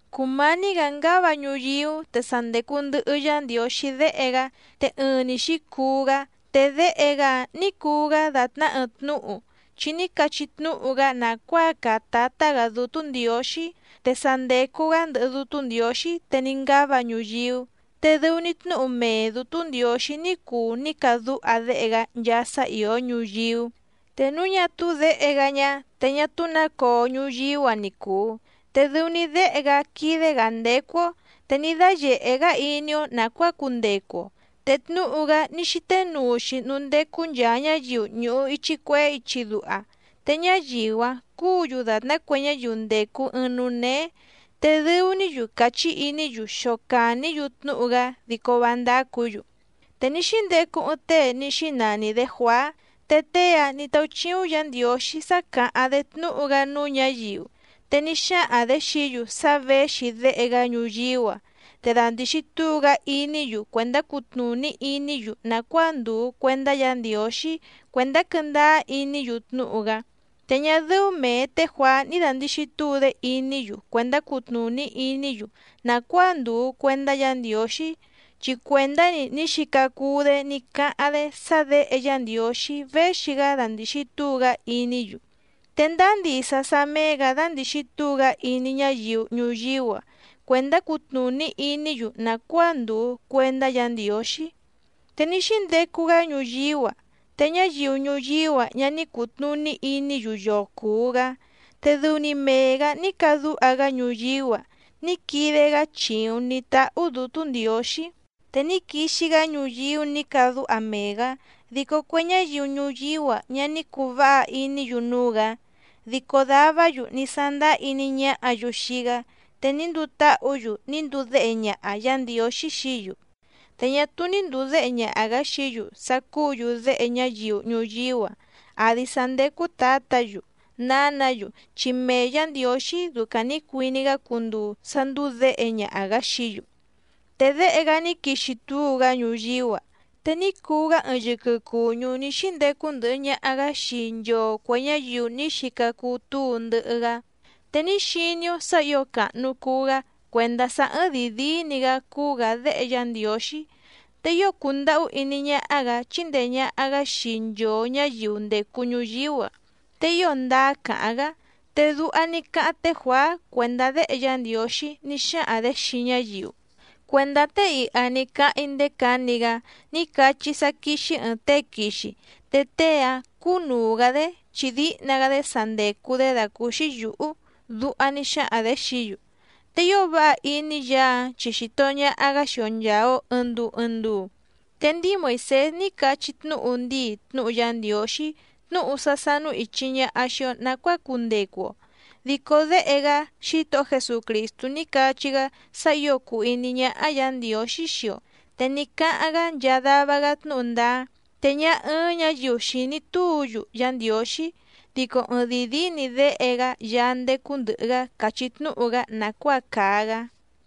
Cùmání‑gǎ ngáva ñuyíú, te sa ndècu ndɨhɨ Yá Ndiǒxí Déhe‑gá. Te ɨɨⁿ‑ni xǐcuu‑gá. Te Déhe‑gá‑áⁿ nǐ cuu‑gá dàtná ɨɨⁿ tnúhu, chi ní cachí tnúhu‑gá nàcuáa càa Tátá‑gǎ Dútú Ndiǒxí. Te sa ndècu‑gá ndɨhɨ Dútú Ndiǒxí te ní ngáva ñuyíú. Te dɨu‑ni tnúhu mee Dǔtú Ndiǒxí ní cuu ní cadúha Déhe‑gá nchaa sá ìó ñuyíú. Te núu ñá túú Děhe‑gá ñá, te ñá túú nǎ coo ñuyíú‑a ni cùu. Te dɨu‑ni Déhe‑gá quídé‑gǎ ndécú‑ó, te ní dáyèhé‑gá iní‑ó nàcuáa cundecu‑o. Te tnúhu‑gá ní xíté nuu‑xi núú ndécú nchàa ñáyiu ñùhu ichi cuehé ichi duha. Te ñáyiu‑áⁿ cúǔ‑yu dàtná cue ñáyiu ndècu ɨɨⁿ núú néé, te dɨu‑ní‑yu cachí iní‑yu xocàní‑yu tnúhu‑gá dico vá ndácǔ‑yu. Te ní xíndecu ɨɨⁿ tée ní xínani‑dě Juàá, te tée‑áⁿ nǐ táúchíúⁿ Yǎ Ndiǒxí sá càháⁿ‑dé tnúhu‑gá núú ñǎyiu. Te ní xáhaⁿ‑dě xií‑yu sá věxi Déhe‑gá ñuyíú‑a, te dandìxi túu‑gá iní‑yu cuèndá cutnùní iní‑yu nàcuáa ndùu cuendá Yǎ Ndiǒxí cuèndá quɨ́ndáá iní‑yu tnúhu‑gá. Te ñá dɨ́ú mèe té Juàá ní dàndixi túu‑dé iní‑yu cuèndá cutnùní iní‑yu nàcuáa ndùu cuendá Yǎ Ndiǒxí, chi cuèndá‑ni ní xica cuu‑dé ní cáháⁿ‑dé sá Děhe Yá Ndiǒxí véxi‑gá dandìxi túu‑gá iní‑yu. Te ndáá ndisa sá méé‑gǎ dándìxi túu‑gá iní ñáyiu ñuyíú‑a cuèndá cutnùní iní‑yu nàcuáa ndùu cuendá Yǎ Ndiǒxí. Te ní xíndecu‑gá ñuyíú‑a, te ñáyiu ñuyíú‑a ñá ní cùtnuní iní‑yu yoo cùu‑gá, te dɨu‑ni mee‑gǎ ní cadúha‑gá ñuyíú‑a ní quide‑gá chìuⁿ ní táhú Dǔtú Ndiǒxí. Te ní quixi‑gá ñuyíú nǐ càdúha mee‑gǎ, dico cue ñáyiu ñuyíú‑a ñá ní cùu váha iní‑yu núú‑gǎ. Dico davá‑yu ní sándáá iní ñáhǎ‑yu xii‑gá, te ní nduu táhǔ‑yu ní nduu déhe ñaha Yǎ Ndiǒxí xií‑yu. Te ñá túú ní ndùu déhe ñaha‑gǎ xií‑yu sá cúǔ‑yu déhe ñáyiu ñuyíú‑a, àdi sá ndécú tǎtǎ‑yu, nǎnǎ‑yu chi mee Yǎ Ndiǒxí ducaⁿ nǐ cuiní‑gá cunduu sá ndúú děhe ñaha‑gǎ xií‑yu. Te Déhe‑gá ní quixi túu‑gá ñuyíú‑a, te ní cuu‑gá ɨɨⁿ yɨquɨ cùñú ní xíndecu ndɨhɨ ñaha‑gǎ xii nchoo cuè ñáyiu ní xica cuu túu ndɨhɨ‑gá. Te ní xiní‑ó sǎ ǐo càhnu cuu‑gá cuèndá sá ɨ́ɨ́ⁿ dìi díí‑ni‑gǎ cúú‑gǎ Déhe Yá Ndiǒxí, te ío cùndahú iní ñáhá‑gǎ chíndèe ñaha‑gá xii nchoo ñǎyiu ndècu ñuyíú‑a, te ío ndáá càháⁿ‑gá. Te duha ní cáháⁿ té Juàá cuèndá Déhe Yá Ndiǒxí ní xáhaⁿ‑dě xii ñáyiu: —Cuèndá tée iha ni cáháⁿ‑í ndéé cǎni‑gá ní cachí‑í sá quíxí ɨ̀ɨⁿ tée quixi. Te tée‑áⁿ cúnùu‑gá‑dé, chi díhna‑gá‑dé sa ndècu‑dé dàcúúxí yǔhú —duha ní xáhaⁿ‑dě xií‑yu. Te ío váha iní Yaá‑áⁿ chi xìto ñaha‑gá xii‑o nchàa‑o ɨɨⁿ nduu ɨɨⁿ nduu. Te ndíi Moìsés ní cachí tnúhu ndíi tnúhu Yá Ndiǒxí tnúhu sá sánú ìchi ñaha xii‑o nacuáa cundecu‑o, dico Déhe‑gá Xítohó Jesucrìstú ní cachí‑gá sá ǐo cùu iní ñáhá Yǎ Ndiǒxí xii‑o. Te ní cáháⁿ‑gá nchaa dava‑gá tnúhu ndáá. Te ñá ɨ́ɨ́ⁿ ñǎyiu xìní túu‑yu Yá Ndiǒxí. Dico ɨɨⁿdìi díí‑ni Déhe‑gá Yaá ndécú ndɨ̀hɨ‑gá càchí tnúhu‑gá nàcuáa càa‑gá.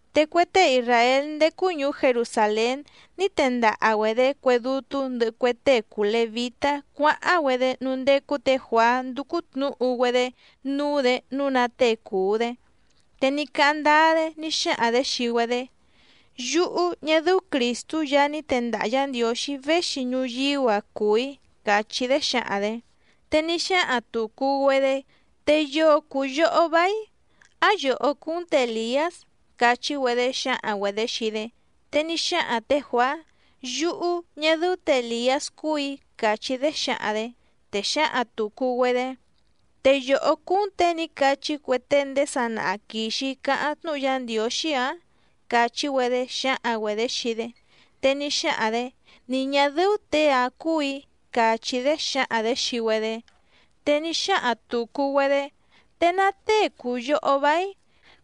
Te cue tée isràél ndécú ñùú Jerusàlén ní tendaha‑güedě cue dútú ndɨhɨ cue tée cùu levítá cuáháⁿ‑güedé núú ndécú tě Juàá ndúcú tnǔhu‑güedé núú‑dě nǔu ná tée cùu‑dé. Te ní cáháⁿ ndáá‑dé ní xáhaⁿ‑dě xii‑güedé: —Yúhú, ñá dɨ́ú Crìstú Yaá ní tendaha Yǎ Ndiǒxí véxi ñuyíú‑a cùu‑í —càchí‑dé xǎhaⁿ‑dě. Te ní xáhaⁿ tùcu‑güedé: —¿Te yoo cùu yohó váíⁿ? ¿Á yòhó cúú‑n tě Èliás? —càchí‑güedé xǎhaⁿ‑güedě xii‑dé. Te ní xáhaⁿ tě Juàá: —Yúhú, ñá dɨ́ú tě Èliás cúù‑í —càchí‑dé xǎhaⁿ‑dě. Te xǎhaⁿ tùcu‑güedé: —¿Te yòhó cúú‑n těe ní cachí cue tée ndéé sanaha quìxi cáháⁿ tnúhu Yá Ndiǒxí‑ǎⁿ? —càchí‑güedé xǎhaⁿ‑güedě xii‑dé. Te ní xáhaⁿ‑dě: —Ni ñà dɨ́ú těe‑áⁿ cúù‑í —càchí‑dé xǎhaⁿ‑dě xii‑güedé. Te ní xáhaⁿ tùcu‑güedé: —¿Te ná tée cùu yohó váíⁿ?,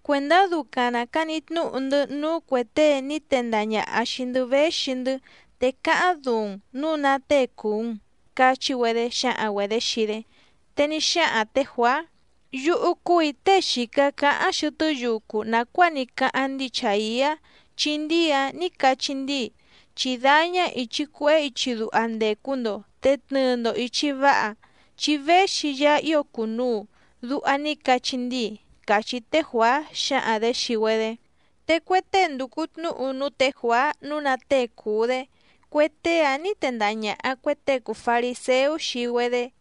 cuèndá ducaⁿ nàcani tnúhu‑ndɨ́ núú cuè tée ní tendaha ñàha xii‑ndɨ́ véxi‑ndɨ́, te cáháⁿ duuⁿ‑n nǔu ná tée cùu‑n —cachí‑güedé xǎhaⁿ‑güedě xii‑dé. Te ní xáhaⁿ tě Juàá: —Yúhú cúù‑í tée xìca cáháⁿ xɨtɨ́ yucu nàcuáa ní cáháⁿ ndíi Chàiá, chi ndíi‑áⁿ nǐ cachí ndíi: “Chí dáñá ìchi cuehé ichi duha ndècu‑ndo te tnɨɨ‑ndo ìchi váha, chi véxi Yaá ío cùnuu”, duha ní cachí ndíi —càchí té Juàá xǎhaⁿ‑dě xii‑güedé. Te cue tée ndùcu tnúhu núú tě Juàá nǔu ná tée cùu‑dé, cue tée‑áⁿ nǐ tendaha ñàha cue tée cùu fariséú xii‑güedé.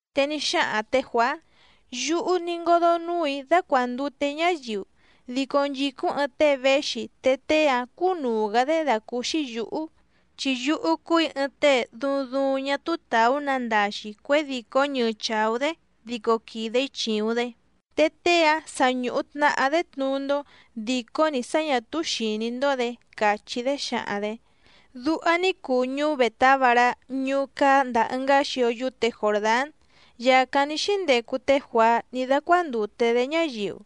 Te ní xáhaⁿ tě Juàá: —Yúhú ní ngódó núù‑í dácuàndute‑í ñáyiu. Dico nchìcúⁿ ɨɨⁿ tée véxi, te tée‑áⁿ cúnùu‑gá‑dé dàcúúxí yǔhú, chi yúhú cúù‑í ɨɨⁿ tée duuⁿ duuⁿ ñá túú tàú nandaxi cuědìcó ñɨɨ chàú‑dé dico quìde‑í chìuⁿ‑dé. Te tée‑áⁿ sa ñùhu tnahá‑dé tnuú‑ndó dìcó‑ni sá ñǎ túú xìní‑ndó‑dě —càchí‑dé xǎhaⁿ‑dě. Duha ní cuu ñuú Bètábará ñuú cáá ndàa ɨngá xio yúte Jòrdán, yàcáⁿ ní xíndecu té Juàá ní dácuándùte‑dé ñáyiu.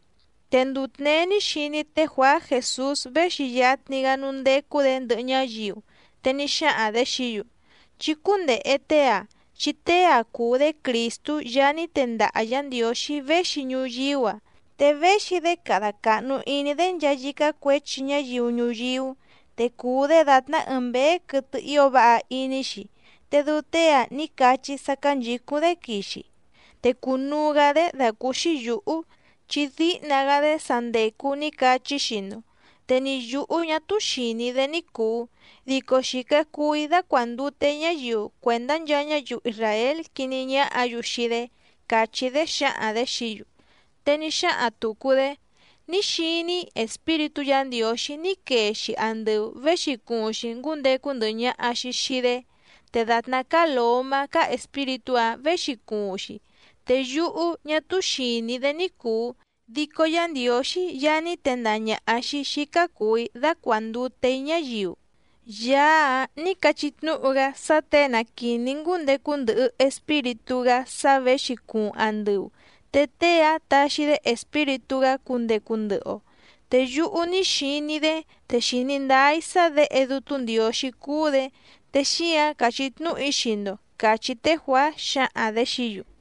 Te nduu tněé ní xiní té Juàá Jèsús véxi yatni‑gá núú ndécú‑dě ndɨhɨ ñáyiu. Te ní xáhaⁿ‑dě xií‑yu: —Chí cúndèhe tée‑ǎⁿ, chi tée‑ǎⁿ cúú‑dě Crìstú Yaá ní tendaha Yǎ Ndiǒxí véxi ñuyíú‑a, te véxi‑dé cada càhnu iní‑dé nchaa yícá cuěchi ñáyiu ñuyíú. Te cùu‑dé dàtná ɨɨⁿ mběé quɨtɨ ío váha iní‑xi. Te dɨu tée‑ǎⁿ ní cachí‑í sá cánchǐcúⁿ‑dé quixi. Te cùnuu‑gá‑dé dàcúúxí yǔhú, chi díhna‑gá‑dé sa ndècu ní cachí‑í xii‑ndo. Te ni yǔhú ñá túú xìní‑í‑dé ní cùu, dico xìca cuu‑í dácuàndute‑í ñáyiu cuèndá nchaa ñáyiu isràél quiní ñáhǎ‑yu xii‑dé —càchí‑dé xǎhaⁿ‑dě xií‑yu. Te ní xáhaⁿ tùcu‑dé: —Ní xiní‑í Espíritú Yǎ Ndiǒxí ní quee‑xi andɨu věxi cuuⁿ‑xi ngúndecu ndɨhɨ ñaha‑xi xìi‑dé, te dàtná cáá lǒmá cáá Espíritú‑áⁿ věxi cuuⁿ‑xi. Te yúhú ñá túú xìní‑í‑dé ní cùu, dico Yá Ndiǒxí Yaá ní tendaha ñàha xii‑í xícá cùu‑í dácuàndute‑í ñáyiu, Yaá‑áⁿ nǐ cachí tnúhu‑gá sá těe na quìní‑í ngúndecu ndɨhɨ Espíritú‑gá sá věxi cuuⁿ andɨu, te tée‑áⁿ taxi‑dé Espíritú‑gá cundecu ndɨhɨ‑o. Te yúhú ní xiní‑í‑dé te xìní ndáá‑í sá Děhe Dútú Ndiǒxí cúú‑dě. Te xíǎⁿ càchí tnúhu‑í xii‑ndo —càchí té Juàá xǎhaⁿ‑dě xií‑yu.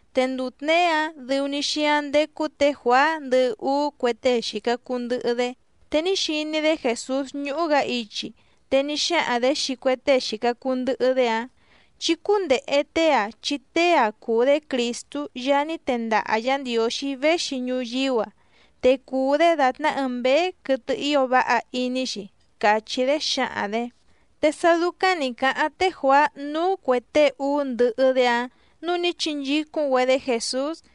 Te nduu tněé‑áⁿ dɨu‑ni xíáⁿ ndécú tě Juàá ndɨhɨ úú cue tée xìca cuu ndɨhɨ‑dé. Te ní xiní‑dé Jèsús ñúhú‑gǎ ichi, te ní xáhaⁿ‑dě xii cue tée xìca cuu ndɨhɨ‑dé‑áⁿ: —Chí cúndèhe tée‑ǎⁿ, chi tée‑ǎⁿ cúú‑dě Crìstú Yaá ní tendaha Yǎ Ndiǒxí véxi ñuyíú‑a. Te cùu‑dé dàtná ɨɨⁿ mběé quɨtɨ ío váha iní‑xi —càchí‑dé xǎhaⁿ‑dě. Te sá dúcáⁿ nǐ cáháⁿ té Juàá núú cuè tée úú ndɨhɨ‑dé‑áⁿ nǔu ní chinchícúⁿ‑güedé Jèsús.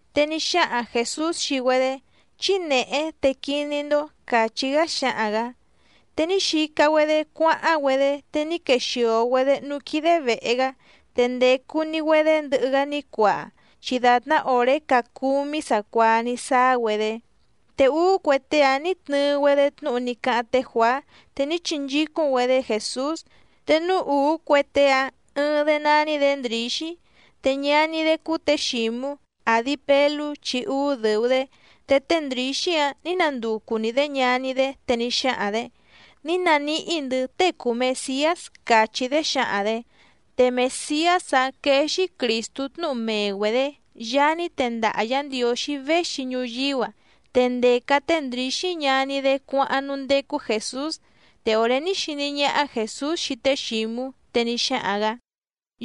Te ní xáhaⁿ Jèsús xii‑güedé: —Chí nèhé te quiní‑ndó —càchí‑gá xáhaⁿ‑gǎ. Te ní xica‑güedé cuáháⁿ‑güedé, te ní quexìo‑güedé núú quídé vèhe‑gá. Te ndècu‑ni‑güedé ndɨhɨ‑gá ní cuaa, chi dàtná òré caa cúmí sacuaa ní sáá‑güedé. Te úú cue tée‑áⁿ nǐ tnɨɨ‑güedé tnúhu ní cáháⁿ té Juàá, te ní chinchícúⁿ‑güedé Jèsús. Te núú ùú cue tée‑áⁿ, ɨɨⁿ‑dé nání‑dě Ndrǐxí, te ñaní‑dé cúú tě Xǐmú, àdi Pelú chi úú dɨ̀u‑dé. Te té Ndrǐxí‑áⁿ nǐ nanducu‑ni‑dě ñaní‑dé te ní xáhaⁿ‑dě: —Ní naníhí‑ndɨ̌ tée cùu Mesiás —càchí‑dé xǎhaⁿ‑dě. Te Mèsiás‑áⁿ quéé‑xí Crìstú tnúhu mee‑güedě, Yaá ní tendaha Yǎ Ndiǒxí véxi ñuyíú‑a. Te ndèca té Ndrǐxí ñaní‑dé cuáháⁿ núú ndécú Jèsús. Te òré ní xiní ñáhá Jèsús xii té Xǐmú, te ní xáhaⁿ‑gǎ: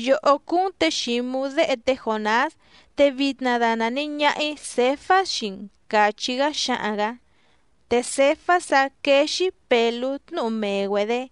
—Yòhó cúú‑n tě Xǐmú déhe té Jònás, te vitna danàni ñaha‑í Cèfás xii‑n —càchí‑gá xáhaⁿ‑gǎ. Te Cèfás‑ǎⁿ quéé‑xí Pèlú tnúhu mee‑güedě.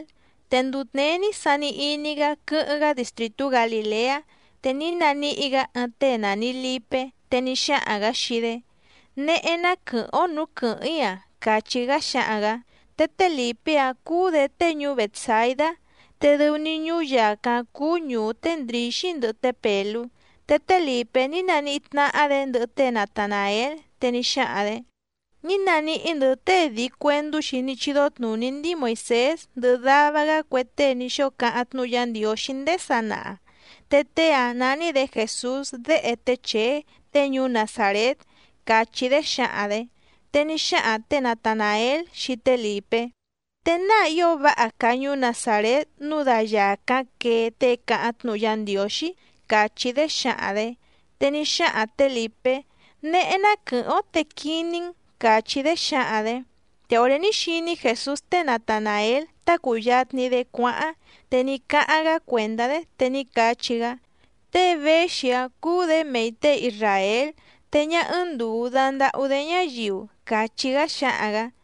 Te nduu tněé ní sani iní‑gá quɨ́hɨ́ⁿ‑gá distrìtú Galìleá. Te ní naníhí‑gǎ ɨɨⁿ tée nàni Lipé, te ní xáhaⁿ‑gǎ xii‑dé: —Néhé ná quɨ̀hɨ́ⁿ‑ó nǔú quɨ̀hɨ́ⁿ‑í‑a —càchí‑gá xáhaⁿ‑gǎ. Te té Lìpé‑áⁿ cúú‑dě tée ñuú Bètsaidá. Te dɨu‑ni ñuú yàcáⁿ cúú ñùú té Ndrǐxí ndɨhɨ té Pèlú. Te té Lìpé ní naníhí tnáhá‑dě ndɨhɨ té Natanàél, te ní xáhaⁿ‑dě: —Ní naníhí‑ndɨ̌ tée dii cuèndú‑xi ní chídó tnùní ndíi Moìsés ndɨhɨ dava‑gá cue tée ní xóo cáháⁿ tnúhu Yá Ndiǒxí ndéé sanaha. Te tée‑áⁿ nání‑dě Jèsús déhe té Chèé, tée ñuú Nazàrét —càchí‑dé xǎhaⁿ‑dě. Te ní xáhaⁿ tě Natanàél xii té Lìpé: —¿Te náa ío váha càa ñuú Nazàrét nǔu da yàcáⁿ quee tée cáháⁿ tnúhu Yá Ndiǒxí? —càchí‑dé xǎhaⁿ‑dě. Te ní xáhaⁿ tě Lìpé: —Néhé ná quɨ̀hɨ́ⁿ‑ó te quiní‑n —càchí‑dé xǎhaⁿ‑dě. Te òré ní xiní Jèsús té Natanàél tá cùyatni‑dé cuáháⁿ, te ní cáháⁿ‑gá cuèndá‑dé te ní cachí‑gá: —Tée véxi‑ǎⁿ cúú‑dě mei těe isràél, te ñá ɨ́ɨ́ⁿ ndùu dandahú‑dé ñáyiu —càchí‑gá xáhaⁿ‑gǎ.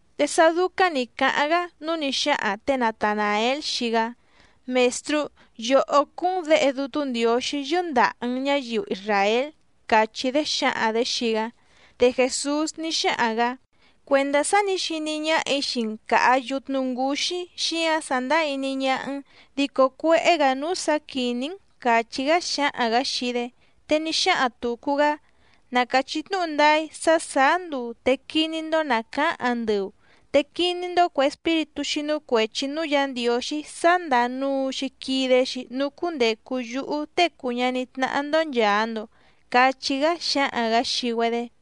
Te sá dúcáⁿ nǐ cáháⁿ‑gá, núu ní xáhaⁿ tě Natanàél xii‑gá: —Mèstrú, yòhó cúú‑n Děhe Dútú Ndiǒxí yɨ́ndàha‑n ñáyiu isràél —càchí‑dé xǎhaⁿ‑dě xii‑gá. Te Jèsús ní xáhaⁿ‑gǎ: —Cuèndá sá nǐ xiní ñáhà‑í xii‑n càha yutnu ngúxí xíǎⁿ iní ñáhá‑n, dico cuéhé‑gǎ núú sǎ quìní‑n —càchí‑gá xáhaⁿ‑gǎ xii‑dé. Te ní xáhaⁿ tùcu‑gá: —Na càchí tnúhu ndáá‑í sá sàá nduu, te quiní‑ndó nàcaáⁿ andɨu. Te quiní‑ndó cuè espíritú xínú cuèchi núú Yǎ Ndiǒxí sá ndàa nuu‑xi quide‑xi núú cúndècu yúhú Tée cùu ñaní tnáhá‑ndó nchàa‑ndo —cachí‑gá xáhaⁿ‑gǎ xii‑güedé.